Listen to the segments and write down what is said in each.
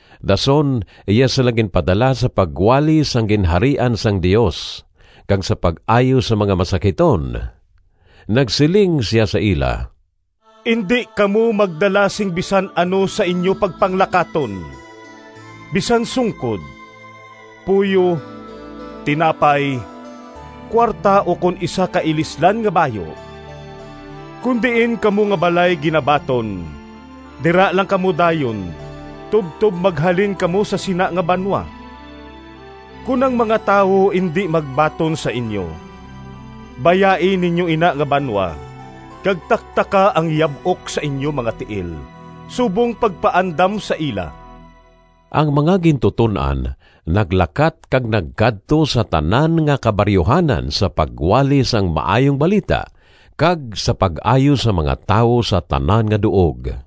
Dason iya sila ginpadala sa pagwali sang Ginharian sang Dios kag sa pag-ayo sang mga masakiton. Nagsiling sia sa ila, “Indi kamo magdala sing bisan ano sa inyo pagpanglakaton: bisan sungkod, puyo, tinapay, kuwarta ukon isa ka ilislan nga bayu. Kon diin kamo nga balay ginabaton, dira lang kamo dayon tubtob maghalin kamo sa sina nga banwa. Kon ang mga tawo indi magbaton sa inyo, bayai ninyo ina nga banwa kag taktaka ang yab-ok sa inyo mga tiil subong pagpaandam sa ila.” Ang mga gintuton-an naglakat kag nagkadto sa tanan nga kabaryuhanan sa pagwali sang Maayong Balita kag sa pag-ayo sang mga tawo sa tanan nga duog.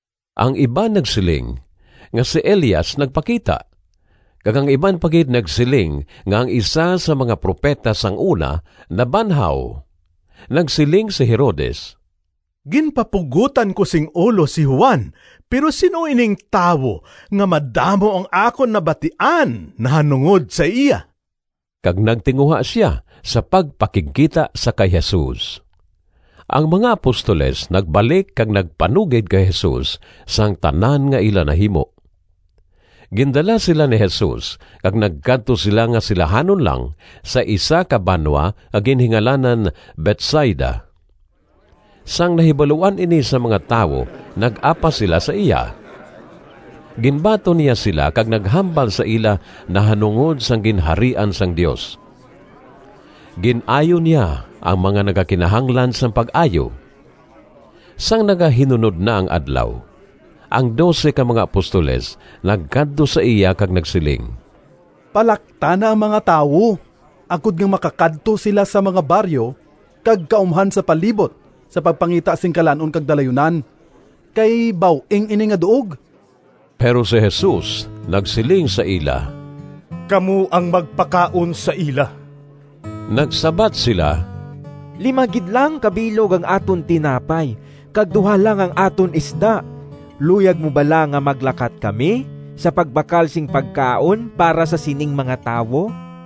Ang iban nagsiling nga si Elias nagpakita, kag ang iban pa gid nagsiling nga ang isa sang mga propeta sang una nabanhaw. Nagsiling si Herodes, “Ginpapugotan ko sing ulo si Juan, pero sin-o ining tawo nga madamo ang akon nabatian nahanungod sa iya?” Kag nagtinguha sia sa pagpakigkita sa kay Jesus. Ang mga apostoles nagbalik kag nagpanugid kay Jesus sang tanan nga ila nahimo. Gindala sila ni Jesus kag nagkadto sila nga silahanon lang sa isa ka banwa nga ginhingalanan Betsaida. Sang nahibaluan ini sang mga tawo nag-apas sila sa iya. Ginbaton niya sila kag naghambal sa ila nahanungod sang Ginharian sang Dios. Gin-ayo niya ang mga nagakinahanglan sang pag-ayo. Sang nagahinunod na ang adlaw, ang dose ka mga apostoles nagkadto sa iya kag nagsiling, “Palakta na ang mga tawo agod nga makakadto sila sa mga baryo kag kaumhan sa palibot sa pagpangita sing kalan-on kag dalayunan kay baw-ing ini nga duog.” Pero si Jesus nagsiling sa ila, “Kamo ang magpakaon sa ila.” Nagsabat sila, “Lima gid lang ka bilog ang aton tinapay kag duha lang ang aton isda. Luyag mo bala nga maglakat kami sa pagbakal sing pagkaon para sa sining mga tawo?”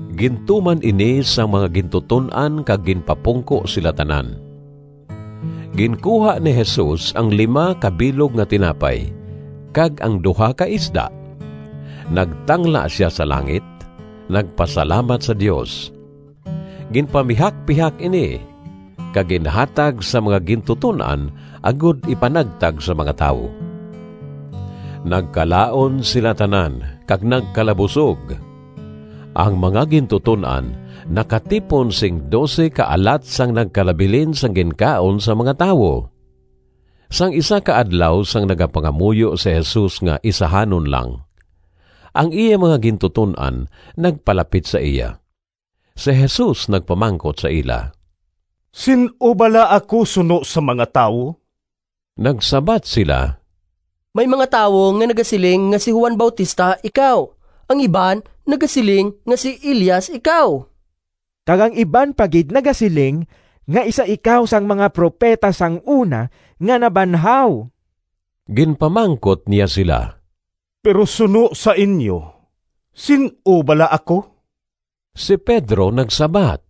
Gintuman ini sang mga gintuton-an kag ginpapungko sila tanan. Ginkuha ni Jesus ang lima ka bilog nga tinapay kag ang duha ka isda, nagtangla sia sa langit, nagpasalamat sa Dios, ginpamihakpihak ini, kag ginhatag sa mga gintuton-an agod ipanagtag sa mga tawo. Nagkalaon sila tanan kag nagkalabusog. Ang mga gintuton-an nakatipon sing dose ka alat sang nagkalabilin sang ginkaon sang mga tawo. Sang isa ka adlaw sang nagapangamuyo si Jesus nga isahanon lang, ang iya mga gintuton-an nagpalapit sa iya. Si Jesus nagpamangkot sa ila, “Sin-o bala ako suno sa mga tawo?” Nagsabat sila, “May mga tawo nga nagasiling nga si Juan Bautista ikaw. Ang iban nagasiling nga si Elias ikaw, kag ang iban pa gid nagasiling nga isa ikaw sang mga propeta sang una nga nabanhaw.” Ginpamangkot niya sila, “Pero suno sa inyo, sin-o bala ako?” Si Pedro nagsabat,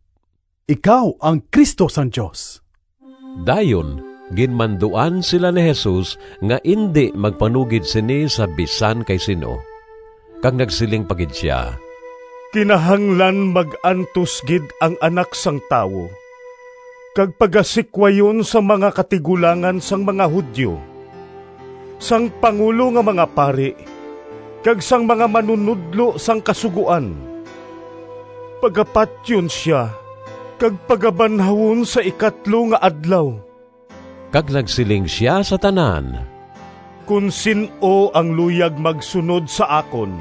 “Ikaw ang Cristo sang Dios.” Dayon ginmanduan sila ni Jesus nga indi magpanugid sini sa bisan kay sin-o. Kag nagsiling pa gid sia, “Kinahanglan mag-antos gid ang Anak sang Tawo kag pagasikwayon sang mga katigulangan sang mga Judio, sang pangulo nga mga pari, kag sang mga manunodlo sang Kasugoan. Pagapatyon sia kag pagabanhawon sa ikatlo nga adlaw.” Kag nagsiling sia sa tanan, “Kon sin-o ang luyag magsunod sa akon,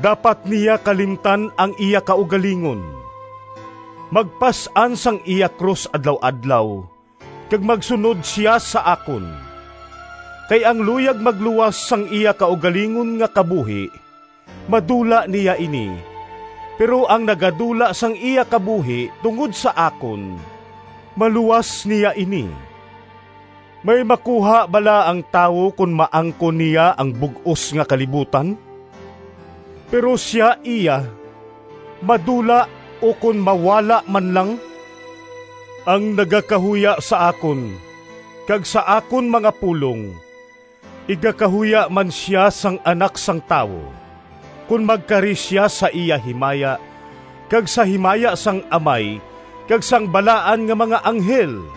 dapat niya kalimtan ang iya kaugalingon, magpas-an sang iya krus adlaw-adlaw, kag magsunod sia sa akon. Kay ang luyag magluwas sang iya kaugalingon nga kabuhi, madula niya ini, pero ang nagadula sang iya kabuhi tungod sa akon, maluwas niya ini. May makuha bala ang tawo kon maangkon niya ang bug-os nga kalibutan, pero sia iya madula ukon mawala man lang? Ang nagakahuya sa akon kag sa akon mga pulong, igakahuya man sia sang Anak sang Tawo kon magkari sia sa iya himaya kag sa himaya sang Amay kag sang balaan nga mga anghel.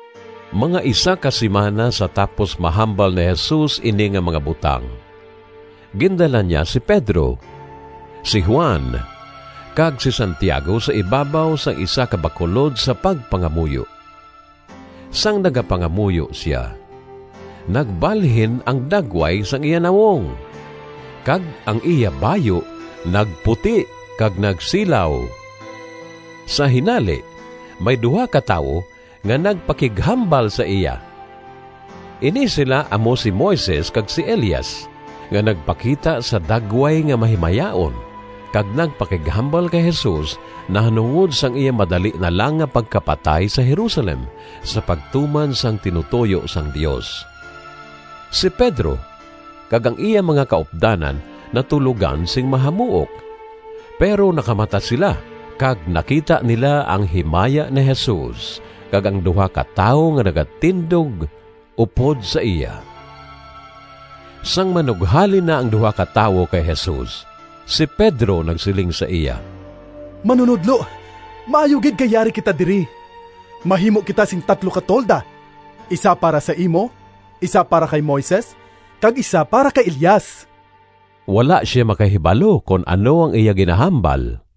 Mga isa ka simana sa tapos mahambal ni Jesus ini nga mga butang, gindala niya si Pedro, si Juan, kag si Santiago sa ibabaw sang isa ka bakulod sa pagpangamuyo. Sang nagapangamuyo sia, nagbalhin ang dagway sang iya nawong kag ang iya bayu nagputi kag nagsilaw. Sa hinali may duha ka tawo nga nagpakighambal sa iya. Ini sila amo si Moises kag si Elias, nga nagpakita sa dagway nga mahimayaon kag nagpakighambal kay Jesus nahanungod sang iya madali na lang nga pagkapatay sa Jerusalem sa pagtuman sang tinutoyo sang Dios. Si Pedro kag ang iya mga kaupdanan natulogan sing mahamuok, pero nakamata sila kag nakita nila ang himaya ni Jesus kag ang duha ka tawo nga nagatindog upod sa iya. Sang manughalin na ang duha ka tawo kay Jesus, si Pedro nagsiling sa iya, “Manunodlo, maayo gid kay yari kita diri. Mahimo kita sing tatlo ka tolda, isa para sa imo, isa para kay Moises kag isa para kay Elias.” (Wala sia makahibalo kon ano ang iya ginahambal.)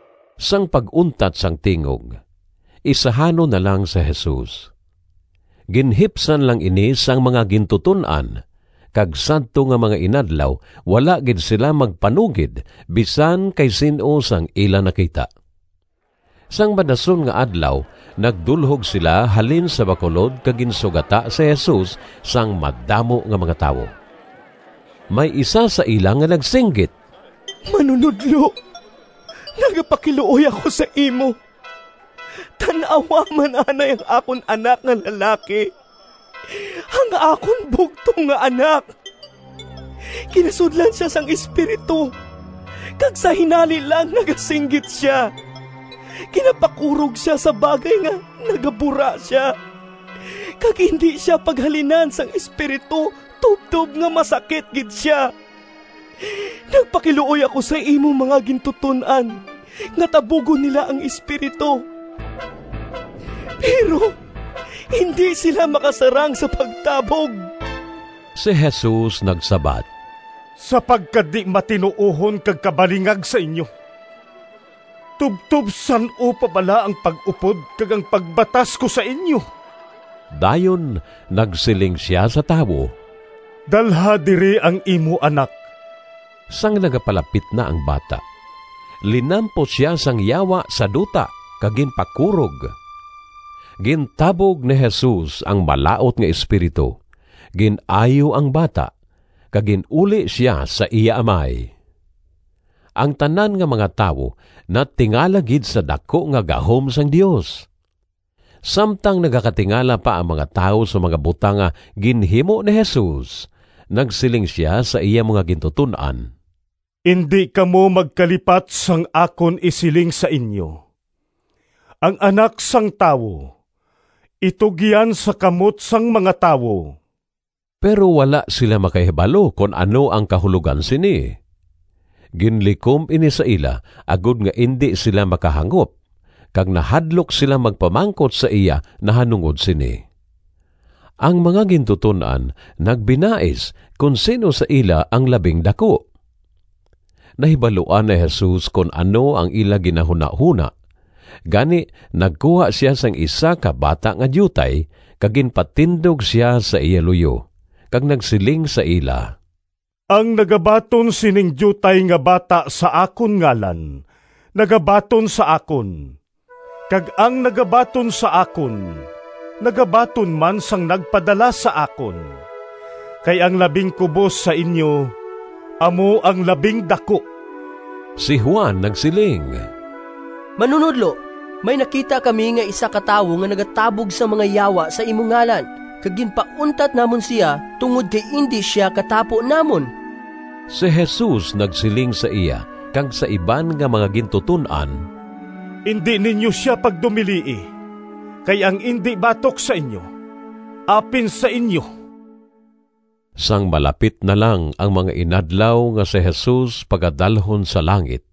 Sang pag-untat sang tingog, isahanon na lang si Jesus. Ginhipsan lang ini sang mga gintuton-an, kag sadto nga mga inadlaw wala gid sila magpanugid bisan kay sin-o sang ila nakita. Sang madason nga adlaw nagdulhog sila halin sa bakulod kag ginsugata si Jesus sang madamo nga mga tawo. May isa sa ila nga nagsinggit, “Manunodlo! Nagapakiluoy ako sa imo, tan-awa man anay ang akon anak nga lalaki, ang akon bugtong nga anak! Ginasudlan sia sang espiritu, kag sa hinali lang nagasinggit sia, ginapakurog sia sa bagay nga nagabura sia, kag indi sia paghalinan sang espiritu tubtob nga masakit gid sia. Nagpakiluoy ako sa imo mga gintuton-an nga tabugon nila ang espiritu, pero indi sila makasarang sa pagtabog.” Si Jesus nagsabat, “Sa pagkadi-matinuohon kag kabalingag sa inyo! Tubtob san-o pa bala ang pag-upod kag ang pagbatas ko sa inyo?” Dayon nagsiling sia sa tawo, “Dalha diri ang imo anak.” Sang nagapalapit na ang bata, linampos sia sang yawa sa duta kag ginpakurog. Gintabog ni Jesus ang malaut nga espiritu, gin-ayo ang bata, kag gin-uli sia sa iya amay. Ang tanan nga mga tawo natingala gid sa daku nga gahom sang Dios. Samtang nagakatingala pa ang mga tawo sa mga butang nga ginhimo ni Jesus, nagsiling sia sa iya mga gintuton-an, “Indi kamo magkalipat sang akon isiling sa inyo. Ang Anak sang Tawo itugyan sa kamot sang mga tawo.” Pero wala sila makahibalo kon ano ang kahulogan sini. Ginlikom ini sa ila agod nga indi sila makahangop, kag nahadlok sila magpamangkot sa iya nahanungod sini. Ang mga gintuton-an nagbinais kon sin-o sa ila ang labing daku. Nahibaluan ni Jesus kon ano ang ila ginahunahona, gani nagkuha sia sing isa ka bata nga diutay kag ginpatindog sia sa iya luyo kag nagsiling sa ila, “Ang nagabaton sining diutay nga bata sa akon ngalan nagabaton sa akon, kag ang nagabaton sa akon nagabaton man sang nagpadala sa akon. Kay ang labing kubos sa inyo amo ang labing daku.” Si Juan nagsiling, “Manunodlo, may nakita kami nga isa ka tawo nga nagatabog sang mga yawa sa imo ngalan, kag ginpauntat namon sia tungod kay indi sia katapo namon.” Si Jesus nagsiling sa iya kag sa iban nga mga gintuton-an, “Indi ninyo sia pagdumilii, kay ang indi batok sa inyo apin sa inyo.” Sang malapit na lang ang mga inadlaw nga si Jesus pagadalhon sa langit,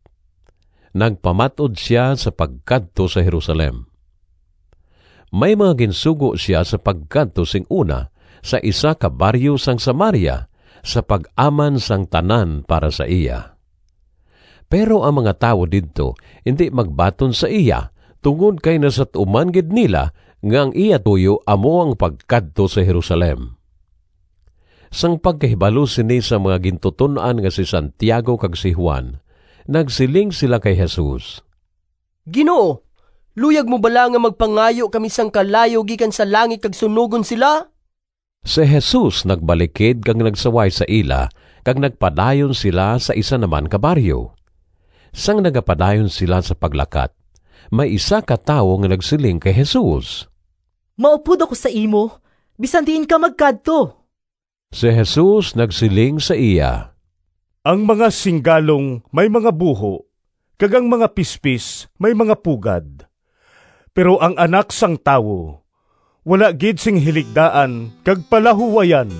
nagpamat-od sia sa pagkadto sa Jerusalem. May mga ginsugo sia sa pagkadto sing una sa isa ka baryo sang Samaria sa pag-aman sang tanan para sa iya. Pero ang mga tawo didto indi magbaton sa iya tungod kay nasat-uman gid nila nga ang iya tuyo amo ang pagkadto sa Jerusalem. Sang pagkahibalo sini sang mga gintuton-an nga si Santiago kag si Juan, nagsiling sila kay Jesus, “Ginoo, luyag mo bala nga magpangayo kami sang kalayo gikan sa langit kag sunogon sila?” Si Jesus nagbalikid kag nagsaway sa ila, kag nagpadayon sila sa isa na man ka baryo. Sang nagapadayon sila sa paglakat, may isa ka tawo nga nagsiling kay Jesus, “Maupod ako sa imo bisan diin ka magkadto.” Si Jesus nagsiling sa iya, “Ang mga singgalong may mga buho, kag ang mga pispis may mga pugad, pero ang Anak sang Tawo wala gid sing hiligdaan kag palahuwayan.”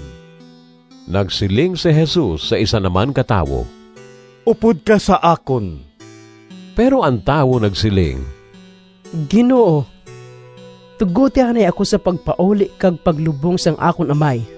Nagsiling si Jesus sa isa na man ka tawo, “Upod ka sa akon.” Pero ang tawo nagsiling, “Ginoo, tugoti anay ako sa pagpauli kag paglubong sang akon amay.”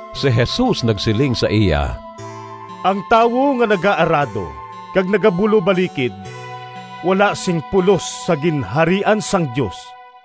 Si Jesus nagsiling sa iya, “Ang tawo nga nagaarado kag nagabulobalikid wala sing pulos sa Ginharian sang Dios.”